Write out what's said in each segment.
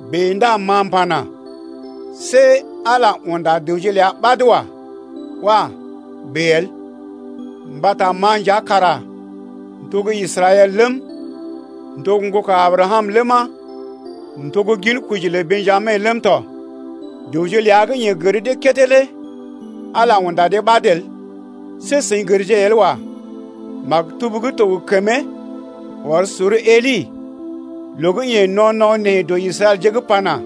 Bèe ndá ma m’pana: See Ala unda dəwje ləa ɓad wa. Wah! bèe el! Mbata ma nja kara m’to gə́ Israɛl ləm, m’to gə́ ŋgoka Abrakam ləma, m’to gə́ ginkoji lə Bḛjami ləm tɔ. Dəwje ləa gə́ yeḛ gər dee kédé lé Ala unda dee ɓad el. See seḭ gərje el wa. Maktub gə́ to gə kəmee ɔr sor Eli loo gə́ yeḛ no̰ no̰ nee dɔ Israɛlje’g pana: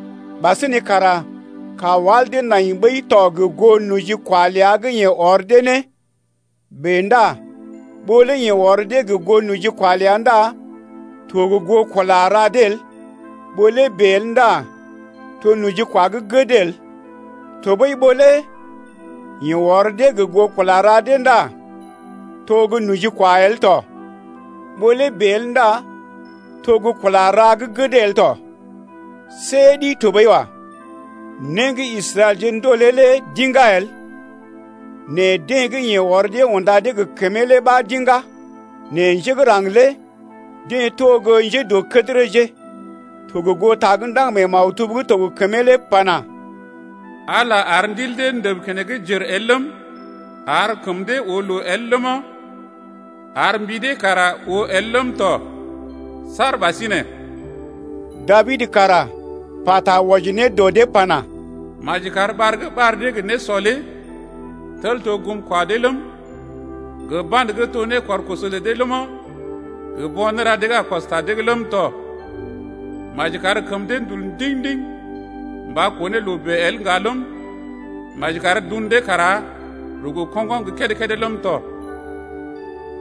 Ɓasinè kara kawal dee nai ɓəi tɔ gə goo nojikwa ləa gə́ yeḛ ɔr dee ne lé. Bèe ndá ɓó lé yeḛ ɔr dee gə goo nojikwa ləa ndá to gə goo kula ra dee el. Ɓó lé bèe el ndá to nojikwa gə́ gəd el. Tɔɓəi ɓó lé yeḛ ɔr dee gə goo kula ra dee ndá to gə́ nojikwa el tɔ. Ɓó lé bèe el ndá to gə́ kula ra gə́ gəd el tɔ. See ɗi tɔɓəi wa. Né gə́ Israɛlje ndolè lé d’iŋgá el nɛ deḛ gə́ yeḛ ɔr dee unda dee gə kəmee lé ɓa d’iŋgá nɛ njé gə́ raŋg lé deḛ to gə́ njédɔkədərəje tɔ gə goo ta gə́ ndaŋg mee maktub gə́ to gə kəmee lé pana: Ala ar ndil dee ndəb keneŋ jèr el ləm, ar kəm dee oo loo el ləma ar, mbi dee kara oo el ləm tɔ saar ɓasinè. Dabid kara pata wɔji ne dɔ dee pana: Maji kar ɓar gə́ ɓar dee gə nésɔ lé tel to gum kwa dee ləm, Gə ba̰də gə́ to né kɔr koso lə dee ləma, Gə bo̰ néra dee gə́ a kɔs ta dee’g ləm tɔ. Maji kar kəm dee ndul ndiŋ-ndiŋ mba koo ne loo bèe el ŋga ləm, Maji kar dun dee kara rugu koŋgoŋ gə́ kédé-kédé ləm tɔ.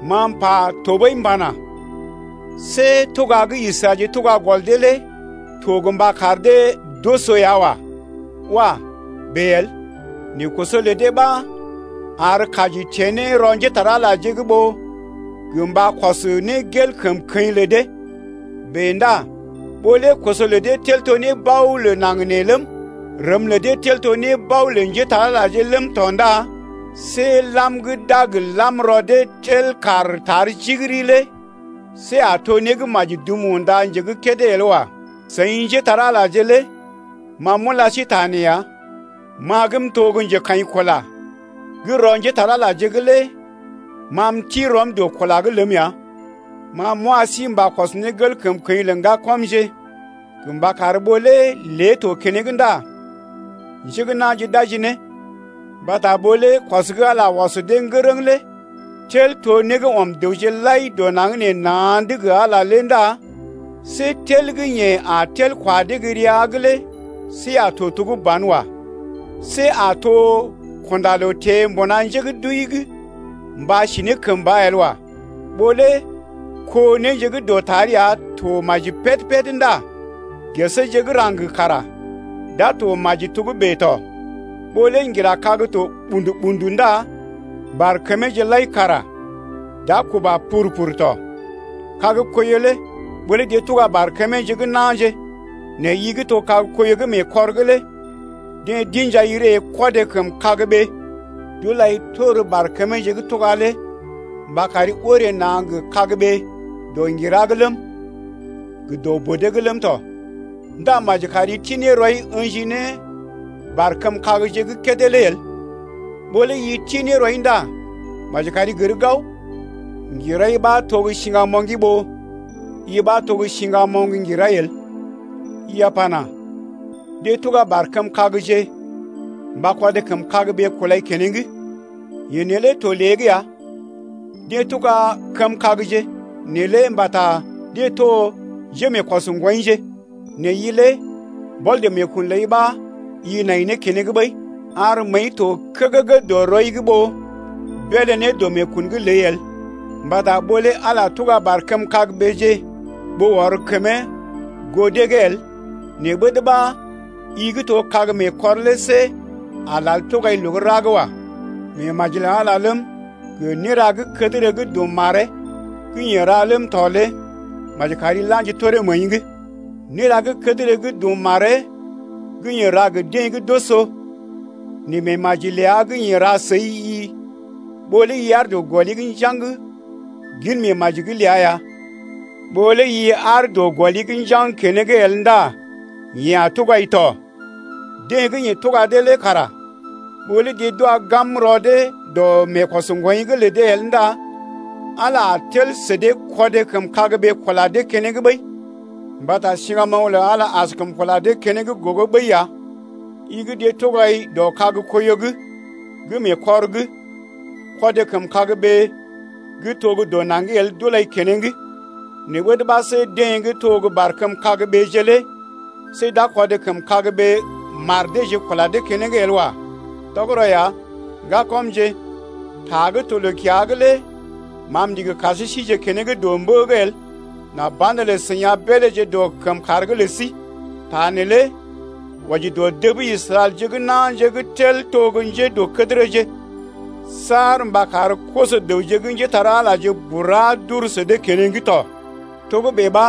Ma m’pa tɔɓəi m’pana: See tuga gə́ Israɛlje tuga gɔl dee lé to gə mba kar dee d’oso ya wa. Wah! bèe el! Nɛ koso lə dee ɓa ar kaji teḛ ne rɔ njépole-magəje’g ɓó gə mba kɔs ne gel kəmkəḭ’g lə dee. Bèe ndá ɓó lé koso lə dee tel to nébao lə naŋg nee ləm, rəm lə dee tel to nébao lə njépole-magəje ləm tɔ ndá see lam gə́ d’a gə lam rɔ dee tel kaar tar jigiri lé see a to né gə́ maji dum unda nje gə́ kédé el wa. Seḭ njépole-magəje lé ma m’ula sí ta nee ya, ma gə́ m’to gə́ njekaḭkula gə́ rɔ njépole-magəje’g lé ma m’ti rɔm dɔ kula’g ləm ya. Ma m’wa sí mba kɔs ne gel kəmkəḭ lə ŋgakamje gə mba kar ɓó lé lé to keneŋ ndá njé gə́ na̰je d’aji ne. Mbata ɓó lé kɔs gə́ Ala ɔs dee ŋgərəŋ lé tel to né gə́ ɔm dəwje lai dɔ naŋg nee na̰’d gə Ala ndá see tel gə́ yeḛ a tel kwa dee gə́ rəa’g lé see a to to gə́ ban wa. See a to kunda loo teḛ mbuna njé gə́ d’wəi’g mba si kəmba lé el wa. Ɓó lé kó néje gə́ dɔtar ya to maji péd-péd ndá geseeje gə́ raŋg kara d’a to maji togə́bè tɔ. Ɓó lé ŋgira kag to ɓṵdu-ɓṵdu ndá barkəmeeje lai kara d’a kuba pur-pur tɔ. Kag-koiyo lé ɓó lé deḛ tuga barkəmeeje gə́ na̰je nɛ i gə́ to gə́ koiyo gə́ mee kɔr’g lé deḛ d’ḭjai ree kɔdé kəm kagɓee d’ulai tor barkəmeeje gə́ tuga lé mba kari orè na̰ gə kagɓee dɔ ŋgira’g ləm, gə dɔ bodee’g ləm tɔ ndá maji kari ti ne rɔi ə̰ji ne barkəm kagje gə́ kédé lé el. Ɓó lé i ti ne rɔi ndá maji kari gər gao, ŋgirai ɓa to gə́ siŋgamoŋgi ɓó i ɓa to gə́ siŋgamoŋ ŋgirai el. I a pana: Deḛ tuga barkəm kagje mba kɔdé kəm kagɓee kulai keneŋ. Yee neelé to lée’g ya, deḛ tuga kəmkagje neelé mbata deḛ to njémeekɔs ŋgwɔḭje nɛ i lé mbɔl dɔ meekun ləi ɓa i nai ne keneŋ ɓəi. Ar məəi to kəgəgə dɔ rɔi’g ɓó beelé ne dɔ meekun’g ləi el. Mbata ɓó lé Ala tuga barkəm kagɓeeje ɓó ɔr kəmee goo dee’g el, nɛ ɓəd ɓa i gə́ to kag mee kɔr lé see a lal tugai loo gə́ ra’g wa. Meemaji lə Ala ləm, gə néra gə́ kədərə gə́ dum maree gə́ yeḛ ra ləm tɔ lé maji kari la̰ji toree məəi’g: néra gə́ kədərə gə́ dum maree gə́ yeḛ a ra gə deḛ gə́ d’oso nɛ meemaji ləa gə́ yeḛ ra səi-i ɓó lé i aar dɔ gɔli’g njaŋg gin meemaji ləa’g ya. Ɓó lé i aar dɔ gɔli’g njaŋg keneŋ el ndá yeḛ a tugai tɔ. Deḛ gə́ yeḛ tuga dee lé kara ɓó lé deḛ d’wa gam rɔ dee dɔ meekɔsŋgwoḭ’g lə dee el ndá Ala a tel sə dee kɔdé kəm kagɓee kula dee keneŋ ɓəi. Mbata siŋgamoŋ lə Ala lé askəm kula dee keneŋ gogo ɓəi ya. I gə́ deḛ tugai dɔ kag koiyo’g gə́ mee kɔr’g, kɔdé kəm kagɓee gə́ to gə́ dɔ naŋgi el d’ulai keneŋ, nɛ ɓəd ɓa see deḛ gə́ to gə́ barkəm kagɓeeje lé see d’a kɔdé kəm kagɓee mar deeje kula dee keneŋ el wa. Tɔgərɔ ya, ŋgakɔmje, ta gə́ to loo-kiya’g lé ma m’ndigi kar sí sije keneŋ dɔ mbə’g el nà banelə seḭ a beeléje dɔ kəmkàr’g lə sí. Ta neelé wɔji dɔ dəb Israɛlje gə́ na̰je gə́ tel to gə́ njédɔkədərəje saar mba kar koso-dəwje gə́ njépole-magəje bura d’uru sə dee keneŋ tɔ. Togə́bè ɓa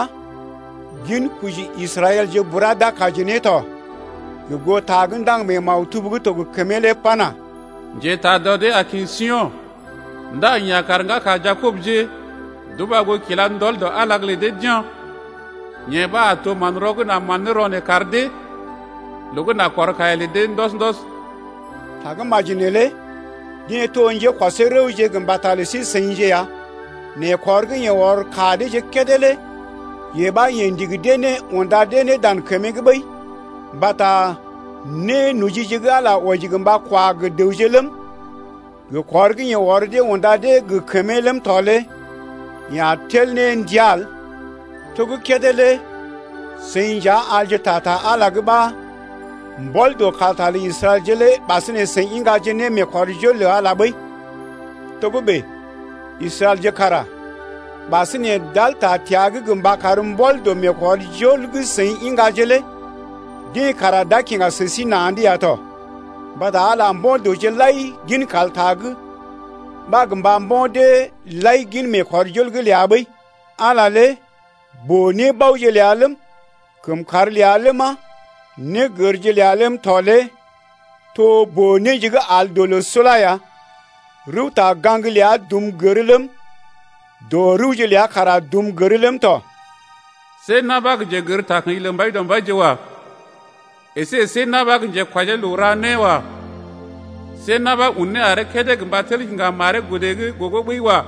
ginkoji Israɛlje bura d’a kaji ne, to gə goo ta gə́ ndaŋg mee maktub gə́ to gə kəmee lé pana: Njetaa dɔ dee a kḭ Sio̰. Ndá yeḛ a kar ŋgaka Jakobje d’uba goo kila ndɔl dɔ Ala’g lə dee d’ya̰. Yee ɓa a to manrɔ gə́ n’a mán ne rɔ neḛ kar dee, Loo gə́ n’a kɔr kaiya lə dee ndɔs-ndɔs. Tagə́maji neelé deḛ to njékɔsee rəwje gə mbata lə sí-seḭje ya. Nɛ kɔr gə́ yeḛ ɔr ka deeje kédé lé yee ɓa yeḛ ndigi dee ne unda dee dan kəmee’g ɓəi. Mbata nénojije gə́ Ala wɔji gə mba kwa gə dəwje ləm, gə kɔr gə́ yeḛ ɔr dee unda dee gə kəmee ləm tɔ lé yeḛ a tel ne ndia el. To gə́ kédé lé seḭ nja alje ta ta Ala’g ɓa mbɔl dɔ kalta lə Israɛlje lé ɓasinè seḭ iŋgaje ne meekɔrjol lə Ala lé ɓəi, togə́bè Israɛlje kara ɓasinè d’al ta təa’g gə mba kar mbɔl dɔ meekɔrjol gə́ seḭ iŋgaje lé deḛ kara d’a kiŋga sə sí na̰’d ya tɔ. Mbata Ala lé mbo̰ dəwje lai gin kalta’g ɓa gə mba mbo̰ deḛ lai gin meekɔrjol’g ləa ɓəi. Ala lé boo-nébaoje ləa ləm, kəmkàr ləa ləma, négərje ləa ləm tɔ lé to boo-néje gə́ al dɔ loo sula ya. Rəwta-gaŋg ləa dum gər ləm, dɔ rəwje ləa kara dum gər ləm tɔ. See na̰ ɓa gə́ njegər takə̰ji lə Mbaidɔmbaije wa. Esé see na̰ ɓa gə́ njekwɔjee loo ra né wa. See na̰ ɓa un né aree kédé Gə mba tel kiŋga maree godə’g gogo ɓəi wa.